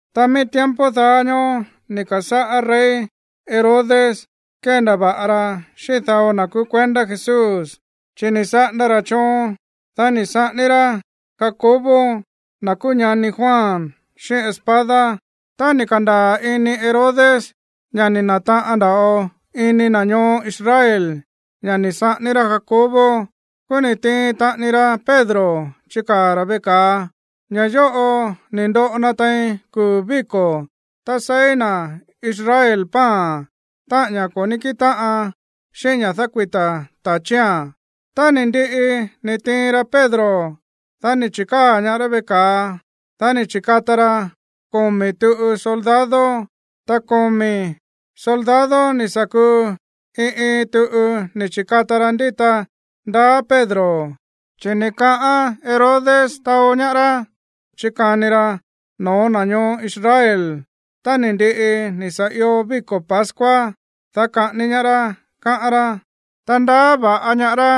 Ta mií tiempo daá ñóó ni̱ ka̱sáꞌá rey Herodes kéndava̱ꞌa ra xíꞌín dao na̱ kúú kuendá Jesús. Chi̱ ni̱ saꞌanda ra̱ choon, dá ni̱ saꞌání rá Jacobo, na̱ kúú ñani Juan, xíꞌín espada. Tá ni̱ ka̱ndaa̱ ini Herodes ña̱ ni̱ na̱taꞌan nda̱ꞌo ini na̱ ñoo Israel ña̱ ni̱ saꞌání rá Jacobo, kúú ni̱ tiin taꞌani ra Pedro chikaa̱ ra̱ veꞌe ka̱a. Ña̱ yóꞌo ni̱ ndoꞌo na tein kuu̱ víko̱ tá seí na̱ Israel pan, táꞌa̱n ña̱ ko̱ ní kíꞌin táꞌan xíꞌín ña̱ dákuita̱ ta̱chía̱n. Tá ni̱ ndiꞌi ni̱ tiin ra Pedro, dá ni̱ chi̱káa̱ ñaá rá veꞌe ka̱a. Dá ni̱ chi̱kata ra komi̱ tuꞌu soldado, ta komi̱ soldado ni̱ sa̱ kuu iin iin tuꞌu ni̱ chi̱kata ra ndíta ndaá Pedro. Chi̱ ni̱ kaꞌán Herodes taó ñaá rá chikani ra no̱ó na̱ ñoo Israel tá ni̱ ndiꞌi ni̱ sa̱ io víko̱ Pascua, dá kaꞌání ñaá rá, káꞌán rá. Ta ndaá va̱ꞌa ñaá rá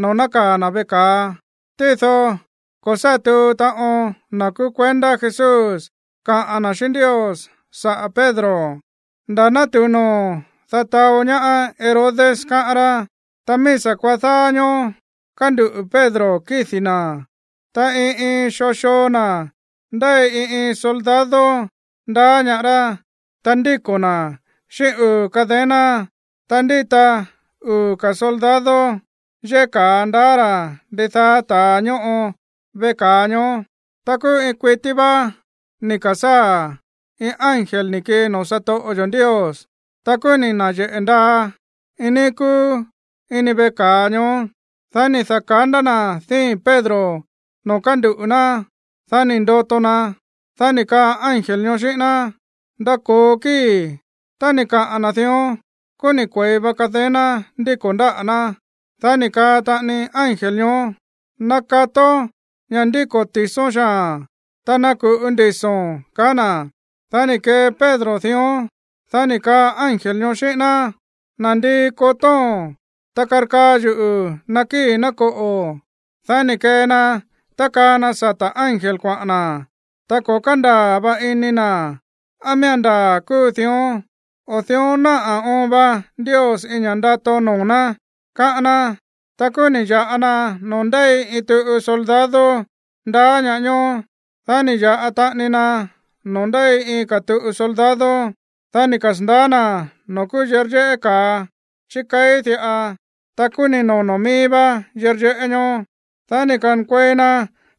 noo̱ nákaa̱ na̱ veꞌe ka̱a. Tído ko̱ sá tuu taꞌon na̱ kúú kuendá Jesús káꞌa̱n na̱ xíꞌín Ndios saꞌa̱ Pedro. Nda̱ ná tu̱u noo̱, dá taó ñaá Herodes, káꞌán rá. Ta mií sa̱kuaá dáá ñóó kánduꞌu̱ Pedro kídi̱ na̱, ta iin iin xoo xoo na̱ ndéi iin iin soldado ndaá ñaá rá. Ta ndíko̱ na̱ xíꞌín uu̱ cadena. Ta ndíta uu̱ ka̱ soldado yéꞌé ka̱a ndaá rá ndidaá ta̱a ñóꞌo veꞌe ka̱a ñoó. Ta kúú iin kuití vá ni̱ ka̱sáa̱ iin ángel ni̱ kii noo̱ satoꞌo yo̱ Ndios. Ta kúú ni̱ na̱yeꞌe̱ ndaa iin níí kúú ini veꞌe ka̱a ñoó. Dá ni̱ da̱ka̱ndá na̱ díi̱n Pedro noo̱ kánduꞌu̱ ná. Dá ni̱ ndoto na. Dá ni̱ kaa ángel ñoó xíꞌín ná: ―Ndako̱o kíi̱. Tá ni̱ kaꞌa̱n na̱ dión, kúú ni̱ kue̱i va cadena ndíko̱ ndáꞌa̱ ná. Dá ni̱ kaa taꞌani ángel ñoó: ―Nakató ña̱ ndíko̱ ti̱són xaa̱n. Ta naku̱ꞌu ndiso̱n ―kaá na̱. Dá ni̱ kee Pedro dión. Dá ni̱ kaa ángel ñoó xíꞌín ná: ―Na̱ndii kotóo̱n, ta karkaa yuꞌu̱. Nakíi̱, ná koꞌo̱. Dá ni̱ kee na tákaa na sata̱ ángel kuaꞌa̱n na̱. Ta ko̱ kándaa̱ va̱ꞌa ini na̱, á miía̱n ndaa̱ kúu dión o dión náꞌa̱ oon va Ndios iin ña̱ꞌa ndato noo̱ ná, káꞌán ná. Ta kúú ni̱ ya̱ꞌa na noo̱ ndéi iin tuꞌu soldado ndaá ñaá ñoó. Dá ni̱ ya̱ꞌa taꞌani na noo̱ ndéi iin ka̱ tuꞌu soldado. Dá ni̱ kasa̱ndaá na̱ noo̱ kúú yiryéꞌé ka̱a chí keí diꞌa. Ta kúú ni̱ nono̱ mií vá yiryéꞌé ñoó. Dá ni̱ ka̱nkuei na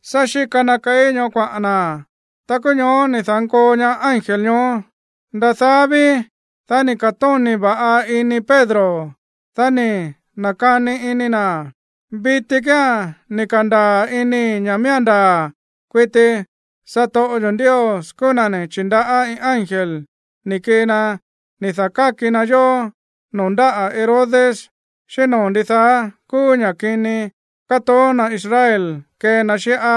sá xíka na keí ñoó kuaꞌa̱n na̱. Ta kúú ñoó ni̱ da̱nkoo ñaá ángel ñoó. Nda̱ daá ví, dá ni̱ ka̱tóni̱ va̱ꞌa ini Pedro, dá ni̱ na̱kani ini na̱: ―Viti kía̱n ni̱ ka̱ndaa̱ inii̱ ña̱ miía̱n ndaa̱ kuiti satoꞌo yo̱ Ndios kúú na̱ ni̱ chi̱ndaꞌá iin ángel ni̱ kii na ni̱ da̱káki na yó noo̱ ndáꞌa̱ Herodes xíꞌín noo̱ ndidaá kúú ña̱ꞌa kini katoó na̱ Israel kee na xíꞌá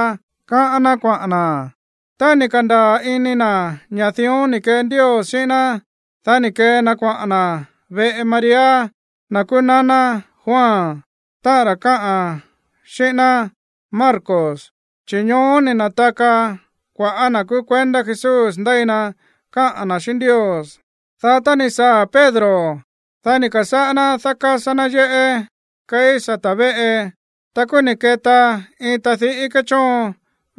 ―káꞌán ná kuaꞌa̱n na̱. Tá ni̱ ka̱ndaa̱ ini na̱ ña̱ dión ni̱ kee Ndios xíꞌín ná, dá ni̱ kee na kuaꞌa̱n na̱ veꞌe María, na̱ kúú naná Juan, táꞌa̱n ra̱ káꞌa̱n xíꞌín ná Marcos. Chi̱ ñoó ni̱ na̱taka kua̱ꞌá na̱ kúú kuendá Jesús ndéi na káꞌa̱n na̱ xíꞌín Ndios. Dá tá ni̱ saa̱ Pedro, dá ni̱ ka̱sáꞌá ná dákásá ná yéꞌé keí sata̱ véꞌe. Ta kúú ni̱ keta iin tadiꞌí kéchóon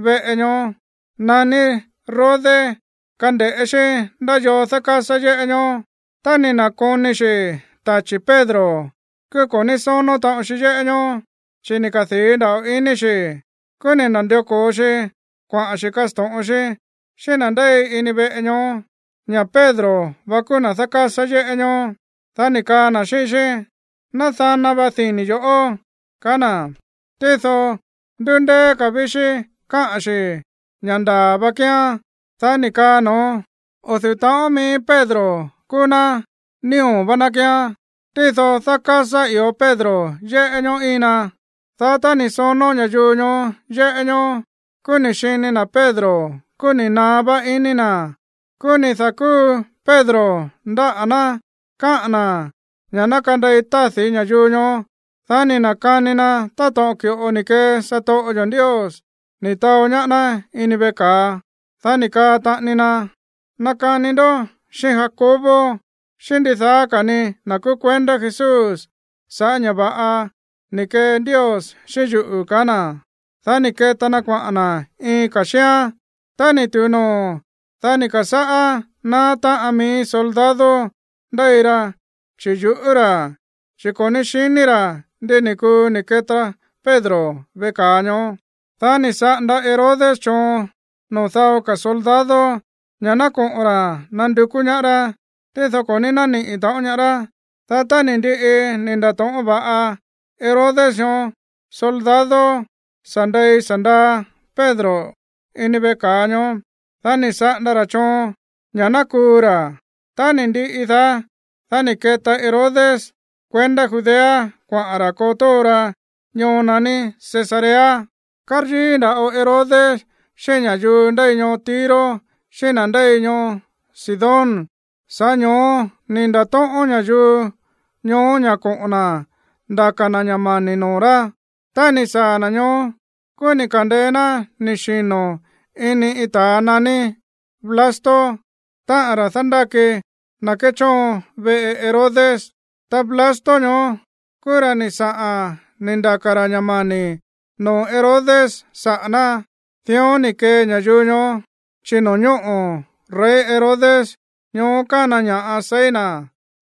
veꞌe ñoó naní Rode kande̱ꞌé xí ndá yoo dákásá yéꞌé ñoó. Tá ni̱ na̱koni xi̱ tachi̱ Pedro, kúú ko̱ ní sónó taꞌon xi yéꞌé ñoó, chi̱ ni̱ kadii̱ nda̱ꞌo ini xi̱. Kúú ni̱ na̱ndió ko̱o xi kuaꞌa̱n xi̱ kasto̱ꞌon xi xíꞌín na̱ ndéi ini veꞌe ñoó ña̱ Pedro va kúú na̱ dákásá yéꞌé ñoó. Dá ni̱ kaa na̱ xíꞌín xí: ―Nádana va dini̱ yo̱ꞌó ―kaá na̱. Tído ndúndéé ka̱ ví xí káꞌa̱n xi̱ ña̱ ndaa̱ va kíán. Dá ni̱ kaa no̱ón: ―O̱ du̱ú taꞌon mií Pedro kúú ná. Nío̱ vá ná kíán. Tído dákásá i̱ó Pedro yéꞌé ñoó íin na. Dá tá ni̱ sonó ña̱yuu ñoó yéꞌé ñoó, kúú ni̱ xini na̱ Pedro, kúú ni̱ naá vá iní na̱. Kúú ni̱ da̱kúu Pedro ndáꞌa̱ ná káꞌa̱n na̱ ña̱ ná kandei tádi̱ ña̱yuu ñoó. Dá ni̱ na̱kani na táto̱ꞌon ki̱ꞌo ni̱ kee satoꞌo yo̱ Ndios ni̱ taó ñaá ná ini veꞌe ka̱a. Dá ni̱ kaa taꞌani na: ―Nakani ndó xíꞌín Jacobo, xíꞌín ndidaá ka̱ ni na̱ kúú kuendá Jesús sa̱ꞌá ña̱ va̱ꞌa ni̱ kee Ndios xíꞌín yuꞌu̱ ―kaá na̱. Dá ni̱ keta na kuaꞌa̱n na̱ iin ka̱ xíán. Tá ni̱ tu̱u noo̱, dá ni̱ ka̱sáꞌá naá táꞌan mií soldado ndéi ra, chi̱ yuꞌú ra̱, chi̱ ko̱ ní xiní ra̱ ndi ni̱ kuu ni̱ keta Pedro veꞌe ka̱a ñoó. Dá ni̱ saꞌanda Herodes choon noo̱ dao ka̱ soldado ña̱ ná koꞌo̱n ra̱ nandukú ñaá rá, tído ko̱ ní nániꞌi̱ taꞌon ñaá rá. Dá tá ni̱ ndiꞌi ni̱ nda̱to̱ꞌón va̱ꞌa Herodes ñoó soldado sa̱ ndei sa̱ ndaa Pedro ini veꞌe ka̱a ñoó, dá ni̱ saꞌanda ra̱ choon ña̱ ná kuu ra̱. Tá ni ndiꞌi daá, dá ni̱ keta Herodes kuendá Judea kuaꞌa̱n ra̱ koo tóo ra ñoo naní Cesarea. Káryíí nda̱ꞌo Herodes xíꞌín ña̱yuu ndéi ñoo Tiro xíꞌín na̱ ndéi ñoo Sidón. Sa̱ꞌá ño̱ó ni̱ nda̱tóꞌón ña̱yuu ñoó ña̱ koꞌo̱n na̱ ndaka̱ na̱ ña̱ mani̱ noo̱ rá. Tá ni̱ saa̱ na̱ ñoó, kúú ni̱ ka̱ndeé ná ni̱ xino̱ ini iin ta̱a naní Blasto, táꞌa̱n ra̱ dándáki na̱ kéchóon veꞌe Herodes. Ta Blasto ñoó kúú ra̱ ni̱ saꞌa̱n ni̱ ndaka̱ ra̱ ña̱ mani̱ noo̱ Herodes saꞌa̱ ná. Dión ni̱ kee ña̱yuu ñoó, chi̱ no̱ñóꞌo̱ rey Herodes ñoó kána ña̱ꞌa seí na̱.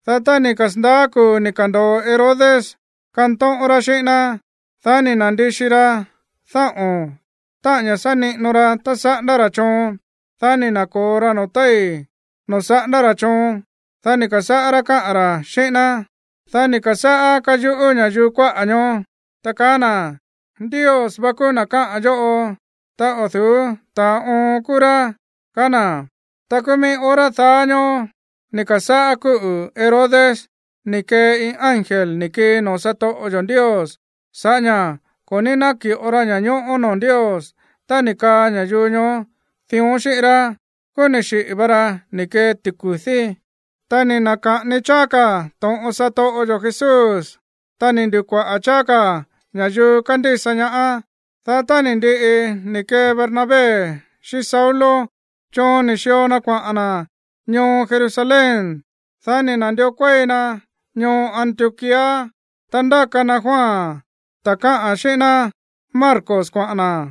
Dá tá ni̱ kasa̱ndaá kuu̱ ni̱ ka̱ndo̱o Herodes kantóꞌón rá xíꞌín ná, dá ni̱ na̱ndixi ra dáꞌo̱n, táꞌa̱n ña̱ sá níꞌino ra tá saꞌándá ra̱ choon. Dá ni̱ na̱ko̱o ra noo̱ téi̱ noo̱ saꞌándá ra̱ choon. Dá ni̱ ka̱sáꞌá rá káꞌa̱n ra̱ xíꞌín ná. Dá ni̱ ka̱sáꞌá káyuꞌú ña̱yuu kuáꞌa̱ ñoó, ta kaá na̱: ―¡Ndios vá kúú na̱ káꞌa̱n yóꞌo, ta o̱ du̱ú ta̱a oon kúú rá! ―kaá na̱. Ta kúú mií hora daá ñóó ni̱ ka̱sáꞌá kúꞌu̱ Herodes ni̱ kee iin ángel ni̱ kii noo̱ satoꞌo yo̱ Ndios sa̱ꞌá ña̱ ko̱ ní náki̱ꞌo ra ña̱ñóꞌó noo̱ Ndios tá ni kaꞌa̱n ña̱yuu ñoó dión xíꞌín rá. Kúú ni̱ xiꞌi̱ va ra ni̱ kee ti̱ku̱dí. Ta ni̱ na̱ka̱ꞌani cháá ka̱ to̱ꞌon satoꞌo yo̱ Jesús, ta ni̱ ndu̱kuaꞌa̱ cháá ka̱ ña̱yuu kándísa ñaá. Dá tá ni̱ ndiꞌi ni̱ kee Bernabé xíꞌín Saulo choon ni̱ xio na kuaꞌa̱n na̱ ñoo Jerusalén, dá ni̱ na̱ndió kuéi na ñoo Antioquía. Ta ndáka na Juan, ta̱ káꞌa̱n xíꞌín ná Marcos, kuaꞌa̱n na̱.